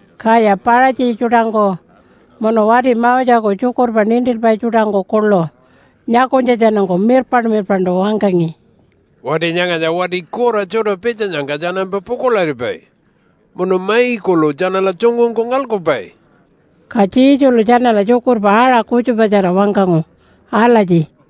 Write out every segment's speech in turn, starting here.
Kaya Paṟatji tjuṯangku munu wati Moseku tjukurpa nintilpai tjuṯangku kuḻu nyakunytjatjanungku mirpaṉ-mirpaṉṯu wangkangi, “Wati nyangatja wati kura tjuṯa pitjanyangka tjanampa pukuḻaripai, munu mai kuḻu tjanala tjungungku ngalkupai.” Ka Jesulu tjanala tjukurpa aṟa kutjupatjara wangkangu alatji,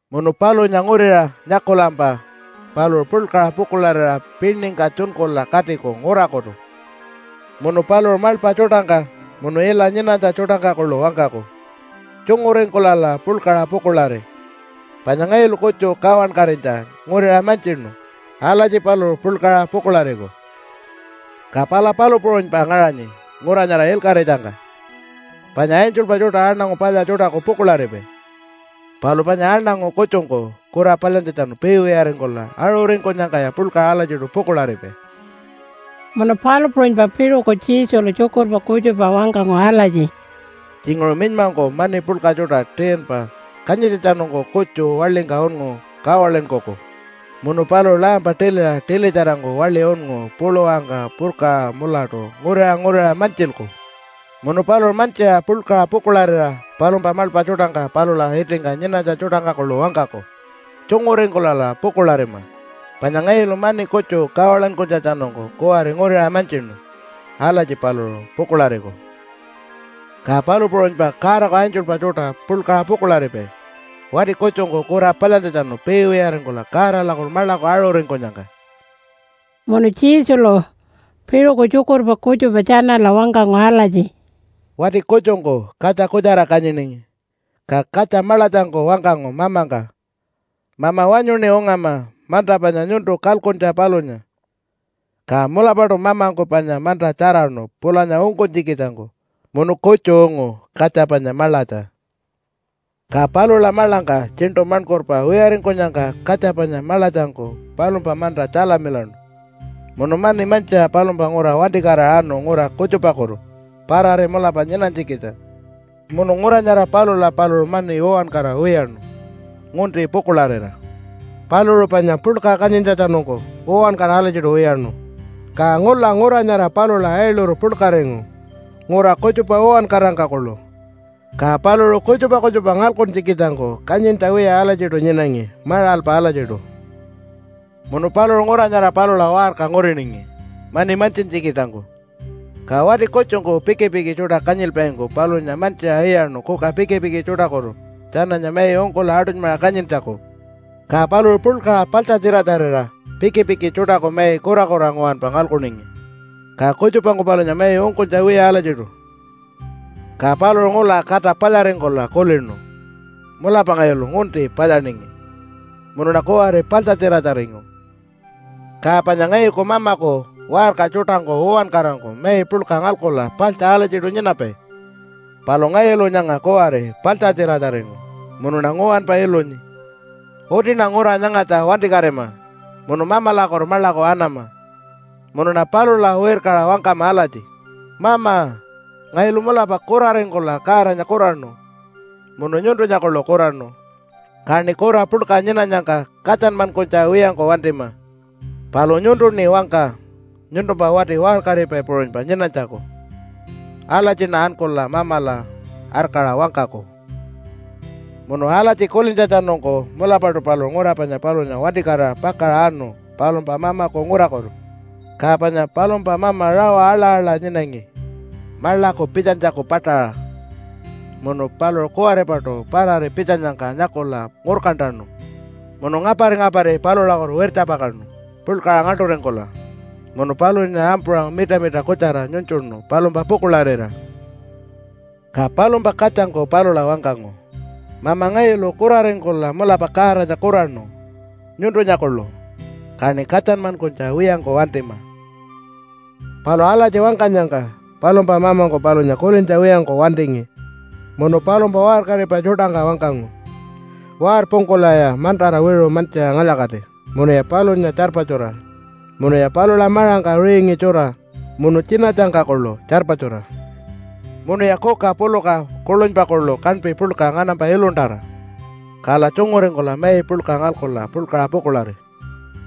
Munu palunya nguriṟa nyakulampa paluṟu puḻkaṟa pukuḻarira piningka tjunkula katiku ngurakutu. Munu paluṟu maḻpa tjuṯangka munu ila nyinanytja tjuṯangka kuḻu wangkaku, ‘Tjunguringkulala puḻkaṟa pukuḻari! Panya ngayulu kutju kawankatinytja nguriṟa mantjinu.’ Alatji paluṟu puḻkaṟa pukuḻariku. “Ka pala palu puṟunypa ngaṟanyi ngura nyara ilkaṟitjangka. Panya angelpa tjuṯa aṉangu palya tjuṯaku pukuḻaripai, palu panya aṉangu kutjungku kura palyantjatjanu piiwiyaringkula aṟuringkunyangkaya puḻkaṟa alatjiṯu pukuḻaripai.” Munu palu puṟunypa piṟuku Jesulu tjukurpa kutjupa wangkangu alatji, “Tjinguṟu minymangku mani puḻka tjuṯa 10-pa kanyintjatjanungku kutju waḻingka unngu kawalinkuku, munu paluṟu lampa tiliṟa tilitjarangku waḻi unngu puluwangka purkaṟa mulatu nguriṟa nguriṟa mantjilku. Munu paluṟu mantjiṟa puḻkaṟa pukuḻarira palumpa maḻpa tjuṯangka palula itingka nyinanytja tjuṯangka kuḻu wangkaku, ‘Tjunguringkulala pukuḻarima, panya ngayulu mani kutju kawalinkunytjatjanungku kuwari nguriṟa mantjinu.’ Alatji paluṟu pukuḻariku. “Ka palu puṟunypa Godaku angelpa tjuṯa puḻkaṟa pukuḻaripai wati kutjungku kura palyantjatjanu piiwiyaringkula Godalakutu maḻaku aṟuringkunyangka.” Munu Jesulu piṟuku tjukurpa kutjupa tjanala wangkangu alatji, “Wati kutjungku katja kutjara kanyiningi. Ka katja maḻatjangku wangkangu mamangka, ‘Mama wanyuṉi ungama manta panya nyuntu kalkuntja palunya.’ Ka mulapaṯu mamangku panya manta tjaraṉu pulanya ungkunytjikitjangku munu kutju ungu katja panya maḻatja. “Ka palula maḻangka tjiṉṯu maṉkurpa wiyaringkunyangka katja panya maḻatjangku palumpa manta tjalamilaṉu munu mani mantjiṟa palumpa ngura wantikatira anu ngura kutjupakutu parari mulapa nyinanytjikitja. Munu ngura nyara palula paluṟu mani uwankara wiyaṉu ngunti pukuḻarira. Paluṟu panya puḻka kanyintjatjanungku uwankara alatjiṯu wiyaṉu. Ka ngula ngura nyara palula ailuru puḻkaringu ngura kutjupa uwankarangka kuḻu. Ka paluṟu kutjupa kutjupa ngalkuntjikitjangku kanyintja wiya alatjiṯu nyinangi maṟalpa alatjiṯu. “Munu paluṟu ngura nyara palula waṟka nguriningi mani mantjintjikitjangku, ka wati kutjungku pikipiki tjuṯa kanyilpaingku palunya mantjiṟa iyaṉu kuka pikipiki tjuṯakutu tjananya mai ungkula aṯunymaṟa kanyintjaku. Ka paluṟu puḻkaṟa paḻtjatjiratjarira pikipiki tjuṯaku mai kurakura nguwanpa ngalkuningi. Ka kutjupangku palunya mai ungkunytja wiya alatjiṯu. “Ka paluṟu ngula kata palyaringkula kulinu, ‘Mulapa ngayulu ngunti palyaningi munuṉa kuwari paḻtjatjiratjaringu. Ka panya ngayuku mamaku waṟka tjuṯangku uwankarangku mai puḻka ngalkula paḻtja alatjiṯu nyinapai, palu ngayulu nyanga kuwari paḻtjatjiratjaringu munuṉa nguwanpa ilunyi. Utiṉa ngura nyangatja wantikatima munu Mamalakutu maḻaku anama munuṉa palula wirkaṟa wangkama alatji, “Mama, ngayulu mulapa kuraringkula Godanya kuraṉu munu nyuntunya kuḻu kuraṉu. Kaṉi kura puḻka nyinanyangka katjanmankunytja wiyangku wantima. Palu nyuntuṉi wangka nyuntumpa wati waṟkaripai puṟunypa nyinanytjaku.” Alatjiṉa ankula Mamala arkaṟa wangkaku.’ “Munu alatji kulintjatjanungku mulapaṯu paluṟu ngura panya palunya wantikatira pakaṟa anu palumpa mamaku ngurakutu. Ka panya palumpa mama rawa aḻa-aḻa nyinangi maḻaku pitjanytjaku paṯaṟa. Munu paluṟu kuwaripaṯu parari pitjanyangka nyakula ngurkantanu munu ngapari-ngapari palulakutu wirtjapakaṉu puḻkaṟa ngaḻṯuringkula munu palunya ampuṟa mitamita kutjara nyunytjuṉu palumpa pukuḻarira. “Ka palumpa katjangku palula wangkangu, ‘Mama, ngayulu kuraringkula mulapa Godanya kuraṉu nyuntunya kuḻu. Kaṉi katjanmankunytja wiyangku wantima.’ “Palu alatji wangkanyangka palumpa mamangku palunya kulintja wiyangku wantingi munu palumpa waṟkaripai tjuṯangka wangkangu, ‘Warpungkulaya mantara wiṟu mantjiṟa ngalya-kati, munuya palunya tjarpatjura munuya palula maṟangka ringi tjura munu tjinatjangka kuḻu tjarpatjura. Munuya kuka puluka kuḻunypa kuḻu kaṉpi puḻka nganampa iluntara, kala tjunguringkula mai puḻka ngalkula puḻkaṟa pukuḻari.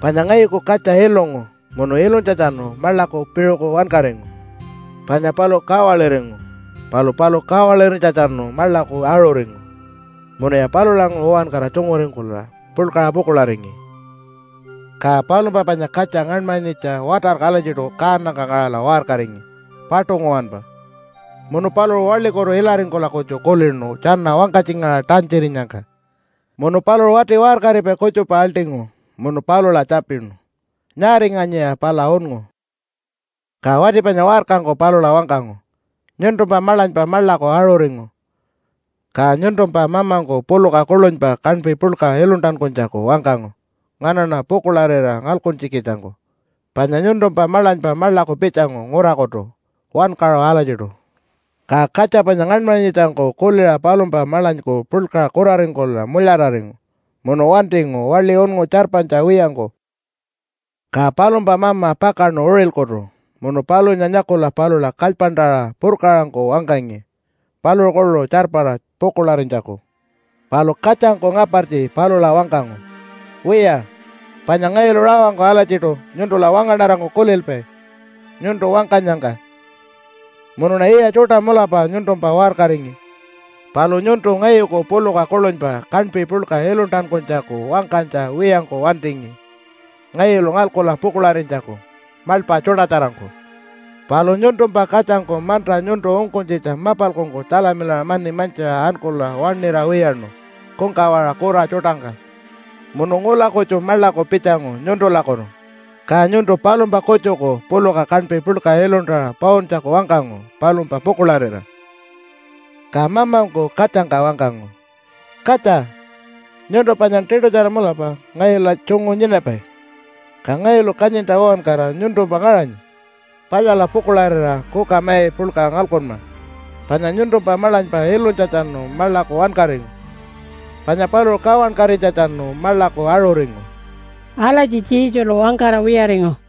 Panya ngayuku katja ilungu munu ilunytjatjanu maḻaku piṟuku wankaringu, panya paluṟu kawaliringu, palu paluṟu kawalirinytjatjanu maḻaku aṟuringu.’ Munuya palulanguṟu uwankara tjunguringkula puḻkaṟa pukuḻaringi. “Ka palumpa panya katja ngaṉmanyitja watarku alatjiṯu kaanangka ngaṟala waṟkaringi paṯu nguwanpa, munu paluṟu waḻikutu ilaringkula kutju kulinu tjana wangkatjingaṟa tantjirinyangka. Munu paluṟu wati waṟkaripai kutjupa aḻṯingu munu palula tjapinu, ‘Nyaaringanyiya pala unngu?’ “Ka wati panya waṟkangku palula wangkangu, ‘Nyuntumpa maḻanypa maḻaku aṟuringu, ka nyuntumpa mamangku puluka kuḻunypa kaṉpi puḻka iluntankunytjaku wangkangu nganaṉa pukuḻarira ngalkuntjikitjangku, panya nyuntumpa maḻanypa maḻaku pitjangu ngurakutu wankaṟu alatjiṯu.’ Ka katja panya ngaṉmanyitjangku kuliṟa palumpa maḻanyku puḻkaṟa kuraringkula mulyararingu munu wantingu waḻi unngu tjarpanytja wiyangku. “Ka palumpa mama pakaṉu uṟilkutu munu palunya nyakula palula kalypantaṟa purkaṟangku wangkangi paluṟu kuḻu tjarpara pukuḻarinytjaku. Palu katjangku ngapartji palula wangkangu, ‘Wiya, panya ngayulu rawangku alatjiṯu nyuntula wangaṉarangku kulilpai nyuntu wangkanyangka munuṉa yiya tjuṯa mulapa nyuntumpa waṟkaringi, palu nyuntu ngayuku puluka kuḻunypa kaṉpi puḻka iluntankunytjaku wangkanytja wiyangku wantingi ngayulu ngalkula pukuḻarinytjaku maḻpa tjuṯatjarangku. Palu nyuntumpa katjangku manta nyuntu ungkunytjitja mapalkungku tjalamilaṟa mani mantjiṟa ankula waṉira wiyaṉu kungkawaṟa kura tjuṯangka munu ngula kutju maḻaku pitjangu nyuntulakutu. Ka nyuntu palumpa kutjuku puluka kaṉpi puḻka iluntaṟa pauntjaku wangkangu palumpa pukuḻarira.’ “Ka mamangku katjangka wangkangu, ‘Katja, nyuntu panyan tiṯutjara mulapa ngayula tjungu nyinapai, ka ngayulu kanyintja uwankara nyuntumpa ngaṟanyi. Palyala pukuḻarira kuka mai puḻka ngalkunma panya nyuntumpa maḻanypa ilunytjatjanu maḻaku wankaringu, panya paluṟu kawankatinytjatjanu maḻaku aṟuringu.’” Alatji Jesulu wangkara wiyaringu.